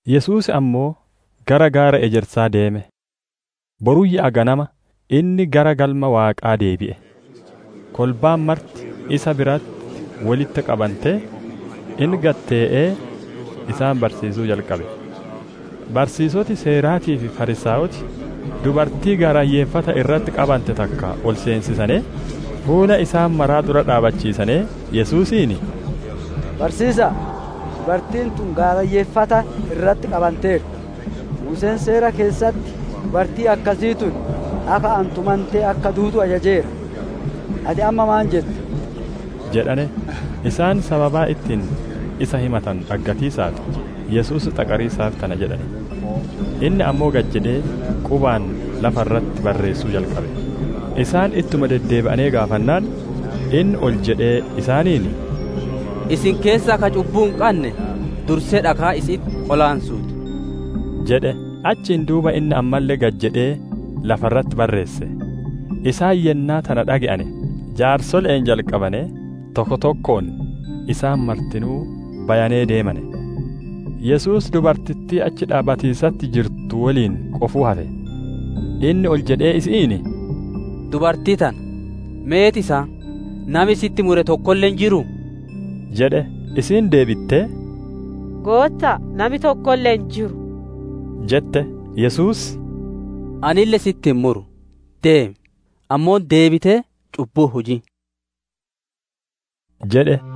Yesuus ammoo gara gaara Ejersaa deeme. Boruyyaa ganama inni gara Galma Waaqaa deebi'e. Kolbaan marti isa biratti wolitti qabantee, inni gad tee'ee isaan barsiisuu jalqabe. Barsiisoti Seeraatii fi Fariisaayoti dubartii gaarayyeeffata irratti qabante takka ol seensisanee, fuula isaan maraa dura dhaabbachiisanee, Yesuusiin, «Barsiisa'a, dubartiin tun gaarayyeeffata irratti qabanteerti. Muuseen Seera keessatti dubartiin akkasii tun dhaka'aan tumantee akka duutu ajajeera. Ati amma maan jetta?» jedhane. Isaan sababa ittiin isa himatanu dhaggatiisaaf, Yesuus xaqariisaaf tana jedhane. Inni ammoo gad jedhee qubaan lafa irratti barreessuu jalqabe. Isaan ittuma deddeebi'anee gaafannaan, inni ol jedhee isaaniin, «Isin keessaa ka cubbuu hin qanne, dursee dhakaa isi'itti qolaansuu ti» jedhe. Achiin duuba inni ammalle gad jedhee lafa irratti barreesse. Isaan yennaa tana dhage'ane, jaarsole'een jalqabanee, tokko tokkoon, isaan martinuu bayanee deemane. Yesuus dubartittii achi dhaabbatiisatti jirtu woliin qofuu hafe. Inni ol jedhee isi'iin, «Dubartii tana, meet isaan? Nami sitti mure tokkolle hin jiruu?» jedhe. Isiin deebittee, «Gootta'a, nami tokkolle hin jiru» jette. Yesuus, «Anille si'itti hin muru. Deemi; ammoo deebitee cubbuu hin hujin» jedhe.]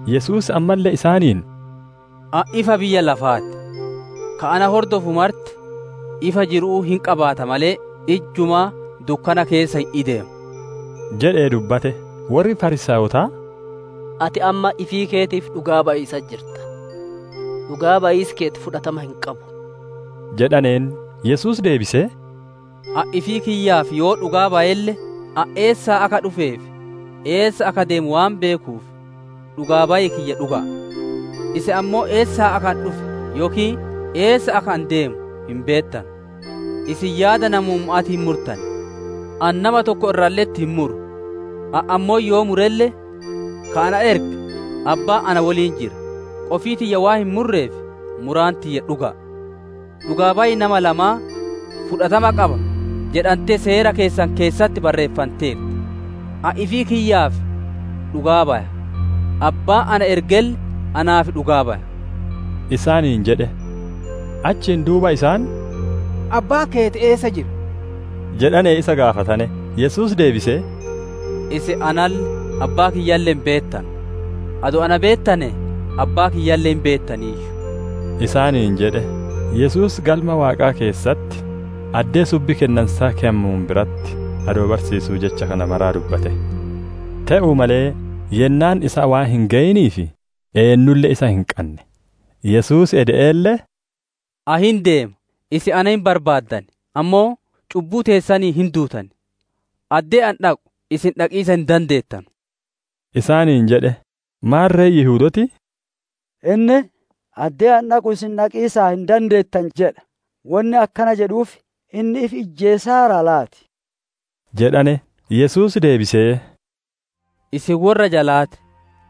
Yesuus ammalle isaaniin, «Ani ifa biyya lafaa ti; ka na hordofu marti ifa jiru'uu hin qabaata malee, ijjumaa dukkana keessa hin ideemu» jedhee dubbate. Worri Fariisaayotaa, «Ati amma ifii keetiif dhugaa bayiisatti jirta; dhugaa bayiisi keeti fudhatama hin qabu» jedhaneen. Yesuus deebisee, «Ani ifii kiyyaaf yoo dhugaa bayelle, ani eessaa akka dhufee fi eessa akka deemu waan beekuuf, dhugaa bayi kiyya dhuga'a. Isin ammoo eessaa akka ani dhufe yookiin eessa akka ani deemu hin beettanu. Isin yaada namumma'aatiin murtan; ani nama tokko irralle'etti hin muru. Ani ammoo yoo murelle, ka na erge Abbaan na woliin jira; qofii tiyya waan hin murreef, muraan tiyya dhuga'a. Dhugaa bayi nama lamaa, fudhatama qaba jedhantee Seera keessan keessatti barreeffanteerti. Ani ifii kiyyaaf dhugaa baya; Abbaan na ergelle naaf dhugaa baya» isaaniin jedhe. Achiin duuba isaan, «Abbaan keeti eessa jira?» jedhanee isa gaafatane. Yesuus deebisee, «Isin analle, Abbaa kiyyaalle hin beettanu; adoo na beettanee Abbaa kiyyaalle hin beettaniiyyu» isaaniin jedhe. Yesuus Galma Waaqaa keessatti, addee subbi kennansaa keyamuun biratti adoo barsiisuu jecha kana mara dubbate. Te'uu malee yennaan isaa waan hin geyiniif eennulle isa hin qanne. Yesuus ede'eelle, «Ani hin deema; isin na hin barbaaddan; ammoo cubbuu teessaniin hin duutan. Addee ani dhaqu isin dhaqiisa hin dandeettanu» isaaniin jedhe. Maarre Yihudooti, «Inni ‹Addee ani dhaqu isin dhaqiisa hin dandeettanu› jedha. Wonni akkana jedhuuf inni ifi ijjeesaaraa laati?» jedhane. Yesuus deebisee, «Isin worra jalaa ti;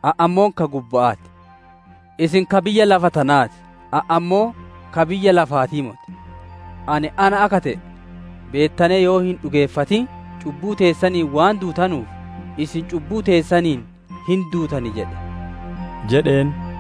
ani ammoo ka gubba'aa ti. Isin ka biyya lafa tanaa ti; ani ammoo ka biyya lafaatii moti. Ani ‹Ana› akka te'e beettanee yoo hin dhugeeffatin, cubbuu teessaniin waan duutanuuf, isin cubbuu teessaniin hin duutan jedhe» jedheen.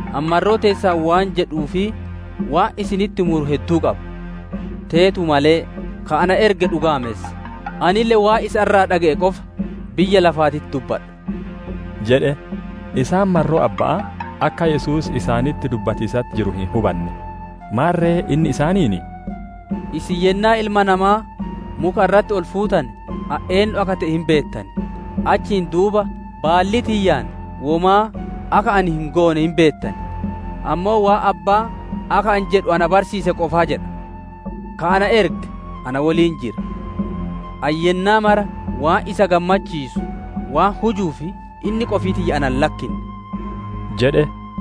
Ani marroo teessan waan jedhuu fi waan isinitti muru hedduu qaba. Teetuu malee, ka na erge dhugaamessa; anille waan isa irraa dhage'e qofa biyya lafaatitti dubbadha» jedhe. Isaan marroo Abba'aa akka Yesuus isaanitti dubbatiisatti jiru hin hubanne. Maarre inni isaaniin, «Isin yennaa Ilma Namaa muka irratti ol fuutane, ani eennu akka te'e hin beettan; achiin duuba baallii tiyyaan womaa akka ani hin goone hin beettan; ammoo waan Abbaan akka ani jedhu na barsiise qofaa jedha. Ka na erge na woliin jira; ani yennaa mara waan isa gammachiisu waan hujuuf, inni qofii tiyya ana hin lakkinne» jedhe.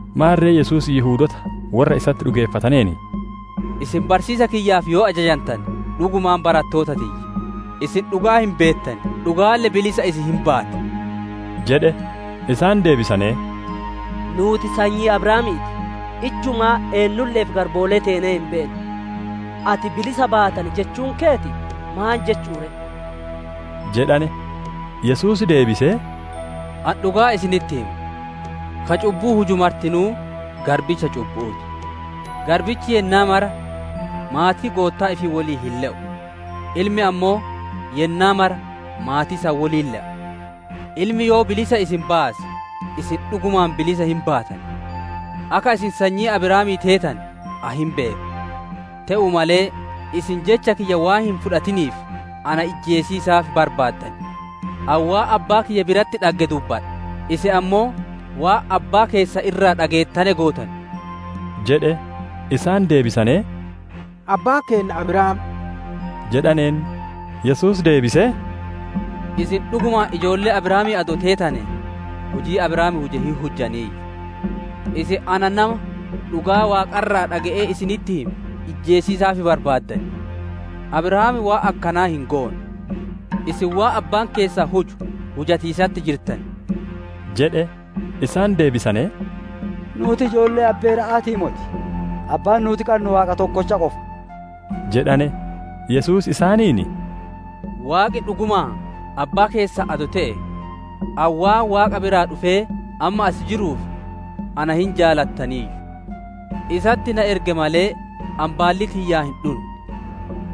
Maarre Yesuus Yihudoota worra isatti dhugeeffateen, «Isin barsiisa kiyyaaf yoo ajajantane, dhugumaan barattoota tiyya; isin dhugaa hin beettan; dhugaalle bilisa isin hin baatti» jedhe. Isaan deebisanee, «Nuuti sanyii Abrahaamii ti; ijjumaa eennulle'eef garboolee teenee hin beennu. Ati, ‹Bilisa baatan› jechuun keeti maan jechu'u ree?» jedhane. Yesuus deebisee, «Ani dhugaa isinitti hima; ka cubbuu huju martinuu garbicha cubbu'uu ti. Garbichi yennaa mara maatii goottaa ifii woliin hin le'u; ilmi ammoo yennaa mara maatii san woliin le'a. Ilmi yoo bilisa isin baase, isin dhugumaan bilisa hin baatan. Akka isin sanyii Abrahaamii teetane ani hin beeka. Te'uu malee isin jecha kiyya waan hin fudhatiniif, na ijjeesiisaaf barbaaddan. Ani waan Abbaa kiyya biratti dhagge dubbadha; isin ammoo waan abbaa keessan irraa dhageettane gootan» jedhe. Isaan deebisanee, «Abbaan keenna Abrahaam» jedhaneen. Yesuus deebisee, «Isin dhugumaan ijoollee Abrahaamii adoo teetanee, hujii Abrahaam huje hin hujjaniiyyu. Isin ana nama dhugaa Waaqa irraa dhage'ee isinitti hime ijjeesiisaaf barbaaddan. Abrahaam waan akkanaa hin goone. Isin waan abbaan keessan huju hujatiisatti jirtan» jedhe. Isaan deebisanee, «Nuuti ijoollee abbeera'aatii moti; Abbaan nuuti qannu Waaqa tokkocha qofa» jedhane. Yesuus isaaniin, «Waaqi dhugumaan Abbaa keessan adoo te'e, ani waan Waaqa biraa dhufee amma as jiruuf, na hin jaalattaniiyyu. Isatti na erge malee, ani baallii tiyyaan hin dhunne.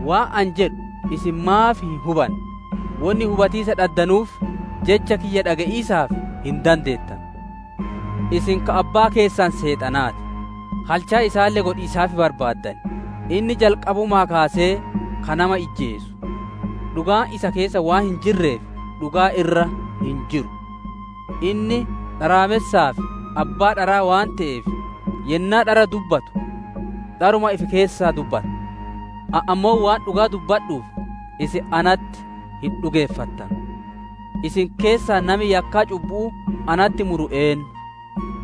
Waan ani jedhu isin maaf hin hubanne? Wonni hubatiisa dhaddanuuf, Jecha kiyya dhage'iisaaf hin dandeettanu. Isin ka abbaa keessan Seexanaa ti; halchaa isaalle godhiisaaf barbaaddan. Inni jalqabumaa kaasee ka nama ijjeesu; dhugaan isa keessa waan hin jirreef, dhugaa irra hin jiru. Inni dharaamessaa fi abbaa dharaa waan te'eef, yennaa dhara dubbatu, dharuma ifi keessaa dubbata. Ani ammoo waan dhugaa dubbadhuuf, isin natti hin dhugeeffattanu. Isin keessaa nami yakkaa cubbu'uu natti muru eennu?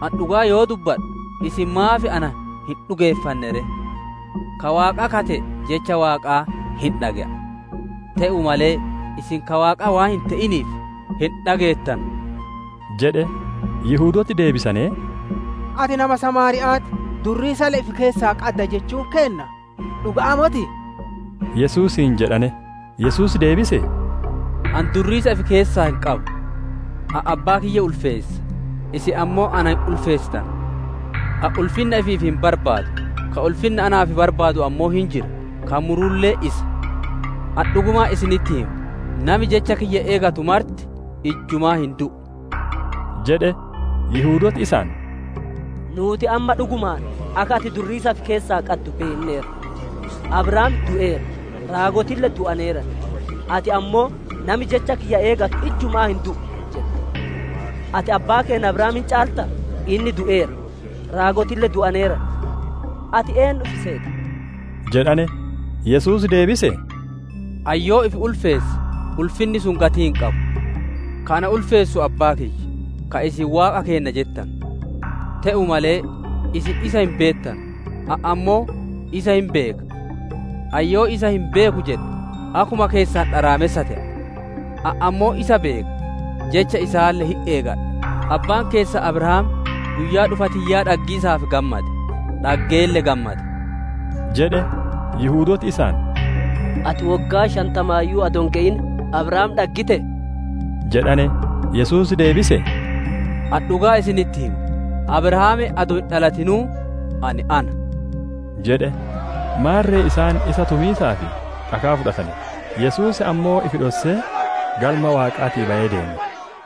Ani dhugaa yoo dubbadhu, isin maaf ana hin dhugeeffanne ree? Ka Waaqaa ka te'e, jecha Waaqaa hin dhage'a. Te'uu malee, isin ka Waaqaa waan hin te'iniif, hin dhageettanu» jedhe. Yihudooti deebisanee, «Ati nama samaariya'aa ti; durriisalle ifi keessaa qadda jechuun keenna dhuga'aa motii?» Yesuusiin jedhane. Yesuus deebisee, «Ani durriisa ifi keessaa hin qabu. Ani abbaa kiyya ulfeessa; isin ammoo na hin ulfeessitanu. Ani ulfinna ifiif hin barbaadu. Ka ulfinna naaf barbaadu ammoo hin jira; ka murulle isa. Ani dhugumaan isinitti hima; nami jecha kiyya eegatu marti ijjumaa hin du'u» jedhe. Yihudooti isaan, «Nuuti amma dhugumaan akka ati durriisa ifi keessaa qaddu beenneerra! Abrahaam du'eera; raagotille du'aneeran; ati ammoo, ‹Nami jecha kiyya eegatu ijjumaa hin du'u› jetta. Ati abbaa keenna Abrahaam hin caaltaa? Inni du'eera; raagotille du'aneeran. Ati eennu ifi seeta?» jedhane. Yesuus deebisee, «Ani yoo ifi ulfeesse, ulfinni sun gatii hin qabu. Ka ana ulfeessu Abbaa kiyya, ka isin Waaqa keenna jettanu. Te'uu malee isin isa hin beettanu; ani ammoo isa hin beeka. Ani yoo isa hin beeku jedhe, akkuma keessan dharaamessa te'a. Ani ammoo isa beeka, jecha isaalle hin eegadha. Abbaan keessan Abrahaam guyyaa dhufa tiyyaa dhaggiisaaf gammade; dhaggeelle gammade» jedhe. Yihudooti isaan, «Ati woggaa shantamaayyuu adoo hin geyin, Abrahaam dhaggitee?» jedhane. Yesuus deebisee, «Ani dhugaa isinitti hima; Abrahaam adoo hin dhalatinuu Ani ‹Ana›» jedhe. Maarre isaan isa tumiisaaf dhakaa fudhatane; Yesuus ammoo ifi dhossee Galma Waaqaatii bayee deeme.